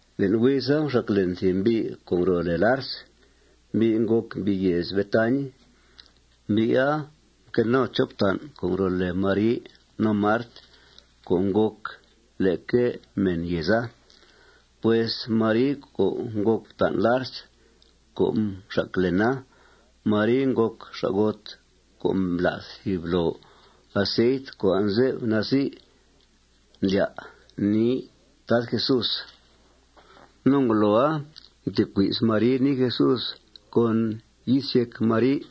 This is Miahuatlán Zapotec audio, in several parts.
Le'n huiza, mxac len thìb mbi' co' ngro' lèe Lars. Mbi' ngòc mbi' yèez Betañ. Mbi'a mque no chop fta'n co' ngro' lèe Mari no Mart co' ngòc leque mèn yèeza. Pues Mari co' ngòc fta'n Lars co' mxac lena, Maria ngòc xa'got co' mblath thìb loo aceit co' anze'f nazi' ndlya' nii Tad Jesús. No ngoloa mtecui's Mari nii Jesús con yis yéc Mari.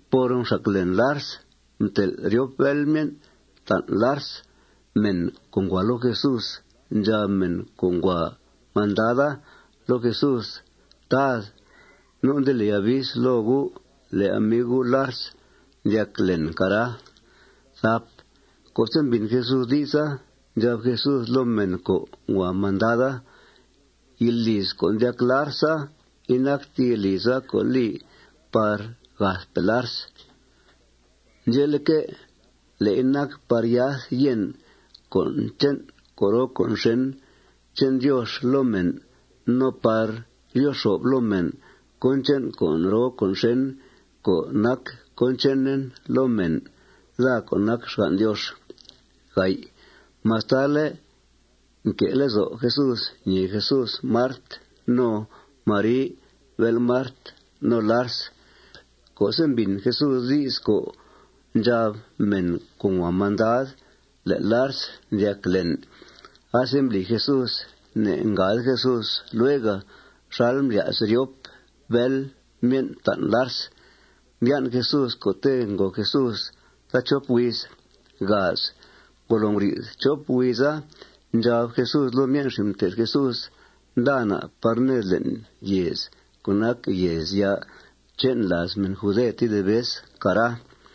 Por mxac len Lars, mtel' ryop bél myen' fta'n Lars mèn co' ngua loo Jesús. Ndxab mèn co' ngua mandada loo Jesús: ―Tad, nu' nde li avis loo U' le' amiu U', Lars, ndyac len, cara. Co'se' mbìn Jesús di'sa, ndxab Jesús loo mèn co' ngua mandada: ―Yilíiz co' ndyac Larsa, inacte yilíiza co' li par gathpe' Lars. Ndxe'leque', le'i nac par yath yèn cón che'n con' roo con' xèn che'n Diox loo mèn no par ryo xo'f loo mèn cón che'n con' roo con' xèn co' nac cón chenen loo mèn, daa co' nac xgan' Diox. Mastale' nque' lezo' Jesús ñèe Jesús Mart no Mari, bél Mart, no Lars, co'se' mbìn Jesús di's co' ndxab mèn co' ngua mandad le' Lars ndyac len, asembli Jesús, ne'ngade Jesús luega xal mblya's ryop bél myen' ftan' Lars. Mbyan' Jesús co'te' ngo Jesús taachop huiz. Ngolo nguri'th chop huiza, ndxab Jesús loo myen' xin' mté'th Jesús: ―Nda na' par ned le'n yèez co' nac yèezya' che'n làaz mèn jude tedib vez, cara.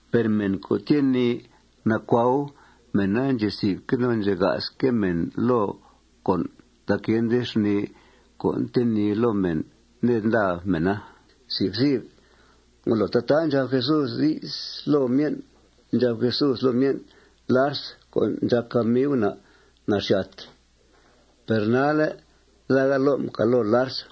Per mèn co' tyee nii nacuau, mèna ndxezi'fque' no ndxega'sque' mèn loo con' tac yende xnìi co' ntenìi loo mèna ned nda mèna. Ngolo tataa ndxab Jesús di's loo myen', ndxab Jesús loo myen': ―Lars co' ndxàc amiu na' naxyàt. Per nalle' daa ga lo' mcal' loo Lars.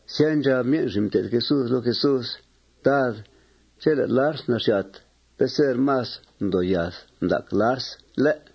Sya, ndxab myen' xin' mté'th Jesús loo Jesús: ―Tad, chele' Lars naxyàt, peser más ndoo yath ndac Lars, ¿lé'?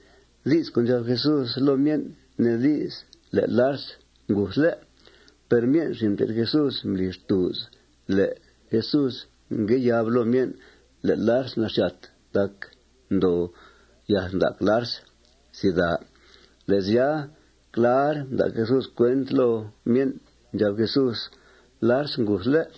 Di's co' ndxab Jesús loo myen' nee di's le' Lars nguthle'. Per myen' xin' mté'th Jesús mbli xtùuz le' Jesús ngue yab loo myen' le' Lars naxyàt tac ndoo yath ndac Lars. Le' sya, clar mda' Jesús cuent loo myen'. Ndxab Jesús: ―Lars nguthle'.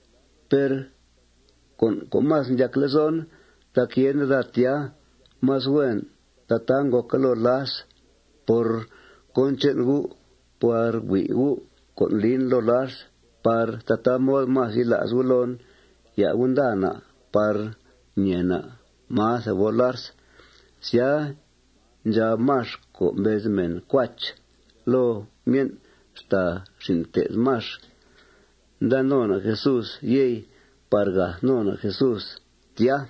Per con' co' más ndyac lezon tac yende daa tya. Más huen tataa ngòca loo Lars por cón che'n gu' par hui' gu' con' lin loo Lars par tataa mod más yila's gu' loon. Ya' gu' nda na' par ñèe na' máa thebol Lars. Sya, ndxab Max, co' mbez mèn Cuach, loo myen' xtàa xin' mté'th Max: ―Nda no na' Jesús, yey, par gath no na' Jesús tya.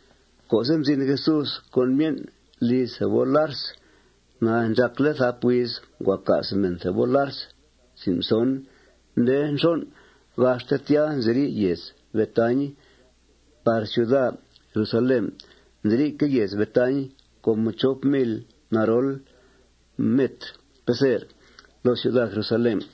Co'se' mzin Jesús con myen' liz thebol Lars, ndxàcle' thap huiz ngua ca's mèn thebol Lars. Nde nxon', gaxte tya nziri' yèez Betañ' par ciuda Jerusalén. Nziri'que' yèez Betañ com chop mil narol metr, peser, loo ciuda Jerusalén.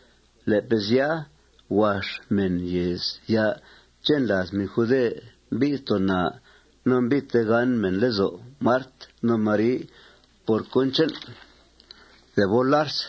Le'pe' sya, huax mèn yèezya' che'n làaz mèn jude mbi'th too naa no mbi'th tegán mèn lezo' Mart no Mari por cón che'n thebol Lars.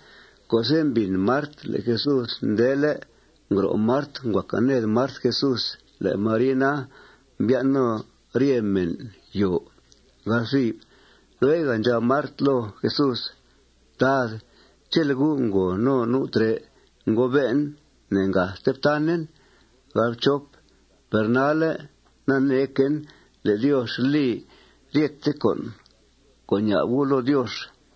Co'se' mbìn Mart le' Jesús ndele', ngro' Mart, ngua càa ned Mart Jesús. Le' Mari na, mbyan' no rye mèna yòo. Lueg ndxab Mart loo Jesús: ―Tad, chele' U' ngo no nu' trè', ngobe'en ne'ngathte ftanen. Per nalle' naneequen le' Diox li ryete con' co' ña'b U' loo Diox.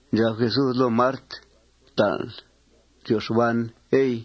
Ndxab Jesús loo Mart: ―Fta'nl ryo xban, ey.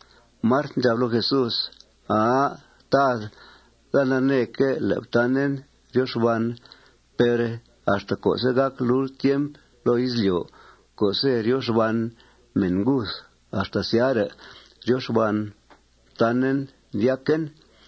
Mart ndxab loo Jesús: ―Aa, Tad, daa naneeque' le' ftanen ryo xban. Per axta co'se' gàc lult tiemp loo izlyo' co'se' ryo xban mèn nguth axta syare' ryo xban ftanen, ndyaquen.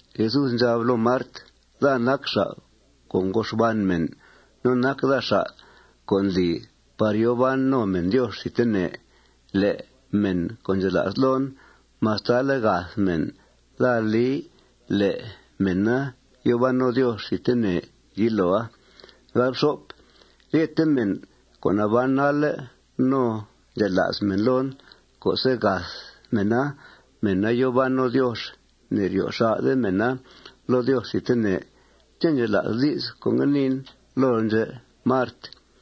Jesús ndxab loo Mart: ―Daa nac xa' co' ngo xban mèn. No nac daa xa' co' ndli par yòo ban no mèn Diox thidtene. Le' mèn co' ndxela's loon, mastale' gath mèn, daa li le' mèna yòo ban no Diox thidtene yiloa. Ryete mèn co' naban nalle' no ndxela's mèn loon, co'se' gath mèna, mèna yòo ban no Diox. Ne'ryo xà'de mèna loo Diox thidtene. ¿Ché' ndxela'sl di's co' ngue niin lool ndxè', Mart?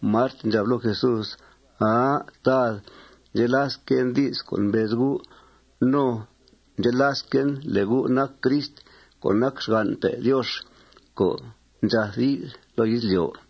Mart ndxab loo Jesús: ―Aa, Tad, ndxelasquen di's co' mbez U'. No ndxelasquen le' U' nac Crist co' nac xgan'pe' Diox co' ndxath yi'th loo izlyo'.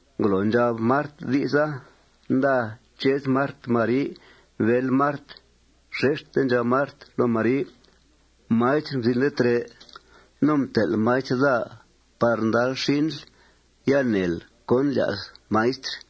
Ngolo ndxab Mart di'sa, nda chez Mart Mari, bél Mart. Xexte ndxab Mart loo Mari: ―Maistr mzinle' trè'. No mtel' Maistr daa par ndal xinl. Ya neel cón ndlya's Maistr.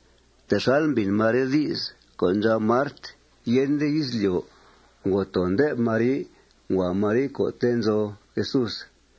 Texal mbìn Mari di's co' ndxab Mart, yende izlyo', ngo too nde'f Mari. Ngua Mari co'te' nzo Jesús.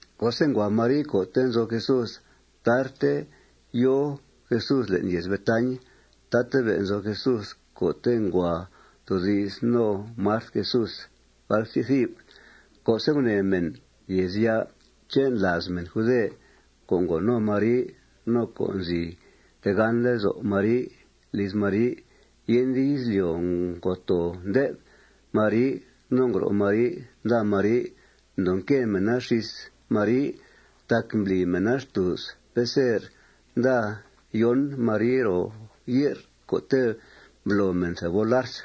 Co'se' ngua Mari co'te' nzo Jesús, tarte yòo Jesús le'n yèez Betañ. Tatabe' nzo Jesús co'te' ngua toodi's no Mart Jesús. Co'se' gunèe mèn yèezya' che'n làaz mèn jude co' ngo no Mari no co' nzi tegán lezo' Mari liz Mari yende izlyo' ngo too ndé'f Mari no ngro' Mari nda Mari, mdoo nque mèna xís Mari. Tac mbli mèna xtùuz peser nda yón' Mari ro ye'r co'te' mblo mèn thebol Lars.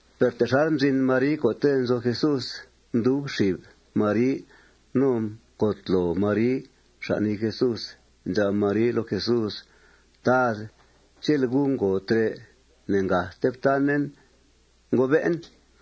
Per texal mzin Mari co'te' nzo Jesús, mdub xib Mari no mcotloo Mari xan' nii Jesús. Ndxab Mari loo Jesús: ―Tad, chele' U' ngo trè', ne'ngathte ftanen, ngobe'en.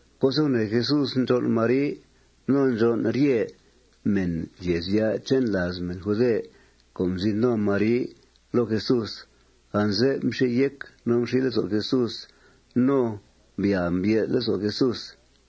Co'se' gunèe Jesús ndxón' Mari no ndxón' rye mèn yèezya' che'n làaz mèn jude co' mzin no Mari loo Jesús, anze'f mxi yéc no mxi lezo' Jesús. No mbyàa mbye'th lezo' Jesús.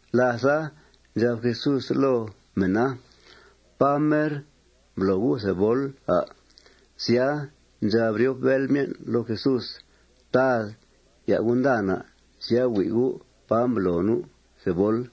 Látha, ndxab Jesús loo mèna: ―¿Pá mer mblo gu' thebol, à'? Sya, ndxab ryop bél myen' loo Jesús: ―Tad, ya' U' nda na'. Sya, hui' U' pá mblo nu' thebol.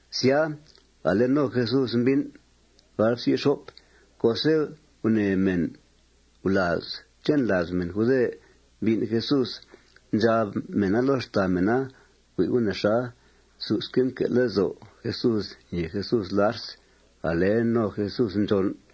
Sya, ale no Jesús mbín'. Co'se' gunèe mèn gulàaz che'n làaz mèn jude mbín' Jesús, ndxab mèna loo xtàa mèna: Hui' gu' nexa. Susque' mque' lezo' Jesús ñèe Jesús Lars. Ale no Jesús ndxón'.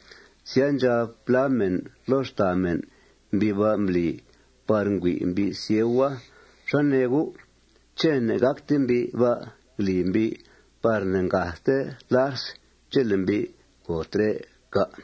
Sya, ndxab plá mèna loo xtàa mèn: ―Mbi' ba' mbli par ngüi' mbi' sieua. ¿Xá nee gu'? ¿Ché' ne'ngácte mbi' ba' ngli mbi' par ne'ngathte Lars chele' mbi' ngo trè', cà'?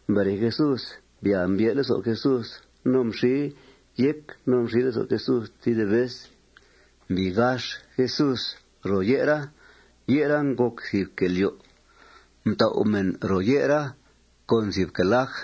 Mbere Jesús, mbyàa mbye'th lezo' Jesús. No mxi yéc no mxi lezo' Jesús tedib vez. Mbii gax Jesús ro ye'ra. Ye'ra ngòc thìb quèe lyo'. Mtau' mèn ro ye'ra con thìb quèe laj.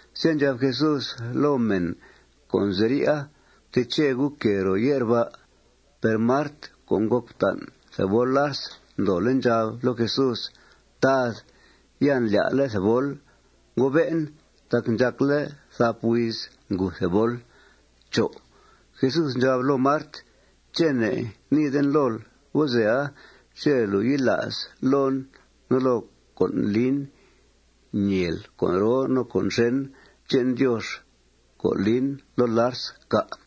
Sya, ndxab Jesús loo mèn co' nziri'a: ―Fteche gu' quèe ro ye'r ba'. Per Mart co' ngòc fta'n thebol Lars ndoole' ndxab loo Jesús: ―Tad, ya ndlya'le' thebol, ngobe'en, tac ndxàcle' thap huiz nguth thebol. Jesús ndxab loo Mart: ―¿Ché' ne'ngniiden lool gozea chele' lùu yila's loon no loo con' lin, ñèel con' roo no con' xèn che'n Diox co' lin loo Lars, cà'?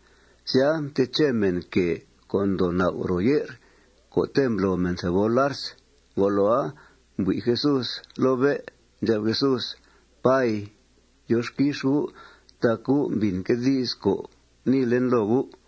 Sya, mteche mèn quèe co' ndoo nau' ro ye'r co'te' mblo mèn thebol Lars. Ngoloa, mbui' Jesús loo bé'. Ndxab Jesús: ―Pay, Diox quix U' tac U' mbìnque' di's co' guniin loo U'.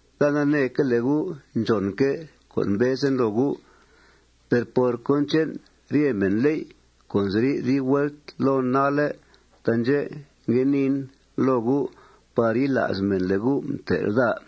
Daa naneeque' le' U' ndxònque' co' mbezen loo U'. Per por cón che'n rye mènléy' co' nziri' dib vuelt loon nalle', taandxè' ngue niin loo U' par yila's mèn le' U' mtel' daa.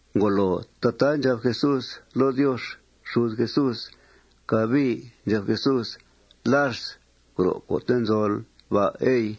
Ngolo tataa ndxab Jesús loo Diox xud Jesús, cabii ndxab Jesús: ―Lars, gro' co'te' nzol ba', ey.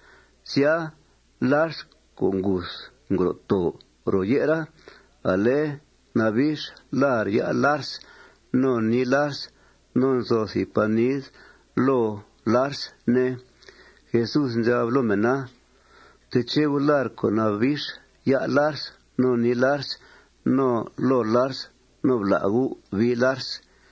Sya, Lars co' nguth ngro' too ro ye'ra. Ale nabix lar' ya' Lars no nii Lars. Nzo thìb panid loo Lars, ne. Jesús ndxab loo mèna: ―Fteche gu' lar' co' nabix ya' Lars no nii Lars no loo Lars. No bla' gu' bii Lars.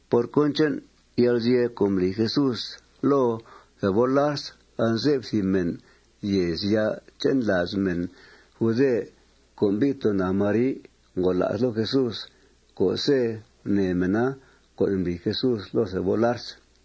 Por cón che'n yalguzye' co' mbli Jesús loo thebol Lars, anze'f thìb mèn yèezya' che'n làaz mèn jude co' mbi'th too naa Mari ngola's loo Jesús co'se' gunèe mèna con' mbli Jesús loo thebol Lars.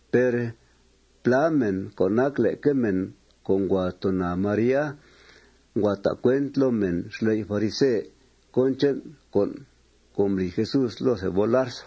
Per plá mèn co' nac leque mèn co' ngua too naa Maria ngua ta' cuent loo mèn xley' farise cón che'n con' mbli Jesús loo thebol Lars.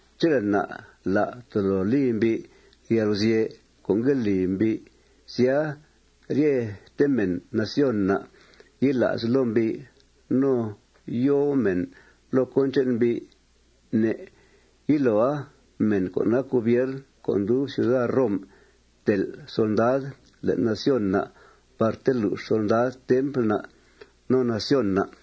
Chele' na' la' tolo li mbi' yalguzye' co' ngue li mbi', sya, ryete mèn nación na' yila's loo mbi' no yòo mèn loo cón che'n mbi'. Ne' yiloa mèn co' nac gobiern co' ndub ciuda Rom tel' solndad le'n nación na' par telux solndad templ na' no nación na'.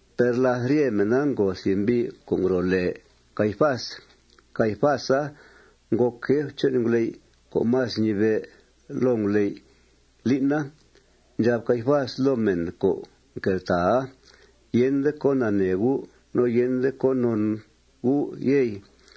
Per làth rye mèna ngo thìb mbi' co' ngro' lèe Caifás. Caifasa ngòc jef che'n nguley' co' más mnibe' loo nguley' lín'a. Ndxab Caifás loo mèn co' mqueltàaa: ―Yende con' nanee gu' no yende con' non gu', yey.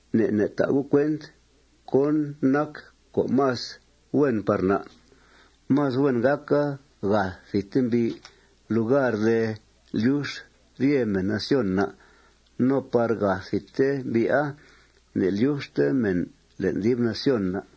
Ne' ne' ta' gu' cuent cón nac con' más huen par na'. Más huen gàca gath thidte mbi' lugar de lyux ryete mèn nación na'. No por gath thidte mbi'a ne'lyuxte mèn le'n dib nación na'.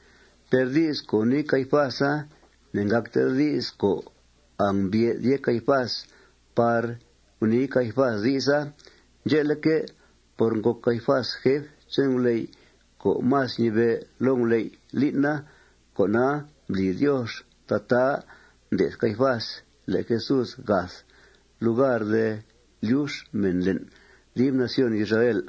Per di's co' gunii Caifasa ne'ngàcte di's co' angmbye'th yéc Caifás par gunii Caifás di'sa. Ndxe'leque', por ngòc Caifás jef che'n nguley' co' más mnibe' loo nguley' lín'a, con'a mbli Diox tataa mde'th Caifás le' Jesús gath lugar de lyux mèn le'n dib nación Israel.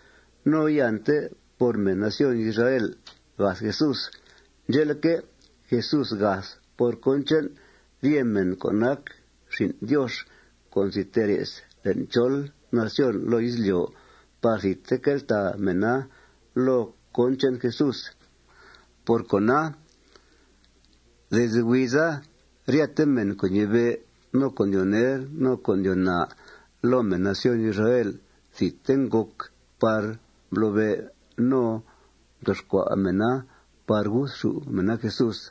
No iante por mèn nación Israel gath Jesús. Ndxe'leque', Jesús gath por cón che'n rye mèn co' nac xin' Diox co' nzi tee re's le'n chol nación loo izlyo' par thidte queltàa mèna loo cón che'n Jesús. Por cona, desde huiza ryete mèn co' ñibe', no co' ndyoo ner, no coo' ndyoo naa loo mèn nación Israel thidte ngòc par mblobe' no mtoxcua' mèna par guthxù' mèna Jesús.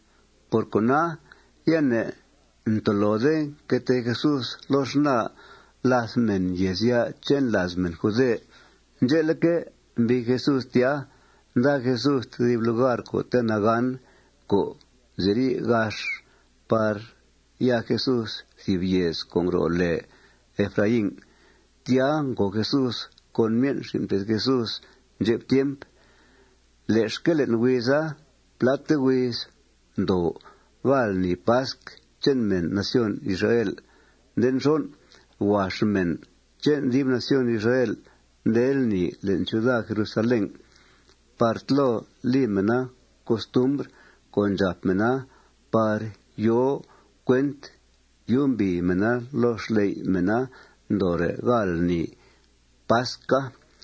Por cona, ya ne'ntolode nque tee Jesús loo xnaa làth mèn yèezya' che'n làaz mèn jude. Ndxe'leque', mbii Jesús tya. Nda Jesús thìb lugar co'te' nagán co' nziri' gax par ya Jesús thìb yèez co' ngro' lèe Efraín. Tya ngo Jesús con myen' xin' mté'th Jesús ndxep tiemp. Le'xque' le'n huiza, pláte huiz ndoo gáal lni pasc che'n mèn nación Israel. Nde nxon', huax mèn che'n dib nación Israel nde lni le'n ciuda Jerusalén par tlo li mèna costumbr co' ndxàp mèna par yòo cuent yumbìi mèna loo xley' mèna ndoore' gáal lni pasca.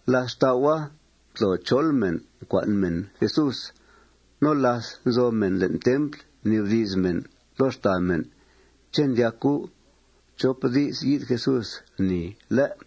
Làth xtau'a, mtlo chol mèn, mcua'n mèn Jesús. No láth nzo mèn le'n templ, mnibdi's mèn loo xtàa mèn: ―¿Ché' ndyac gu' chop di's yi'th Jesús lni, lé'?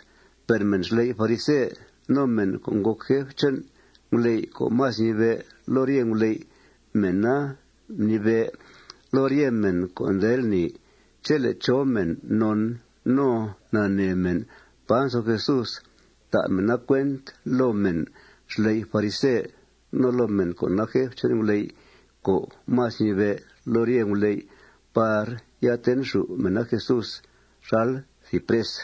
Per mèn xley' farise no mèn co' ngòc jef che'n nguley' co' más ñibe' loo rye nguley', mèna mnibe' loo rye mèn co' nde lni chele' chó mèn non no nanee mèn pá nzo Jesús, ta' mèna cuent loo mèn xley' farise no loo mèn co' nac jef che'n nguley' co' más ñibe' loo rye nguley' par ya tenxù' mèna Jesús xal thìb pres.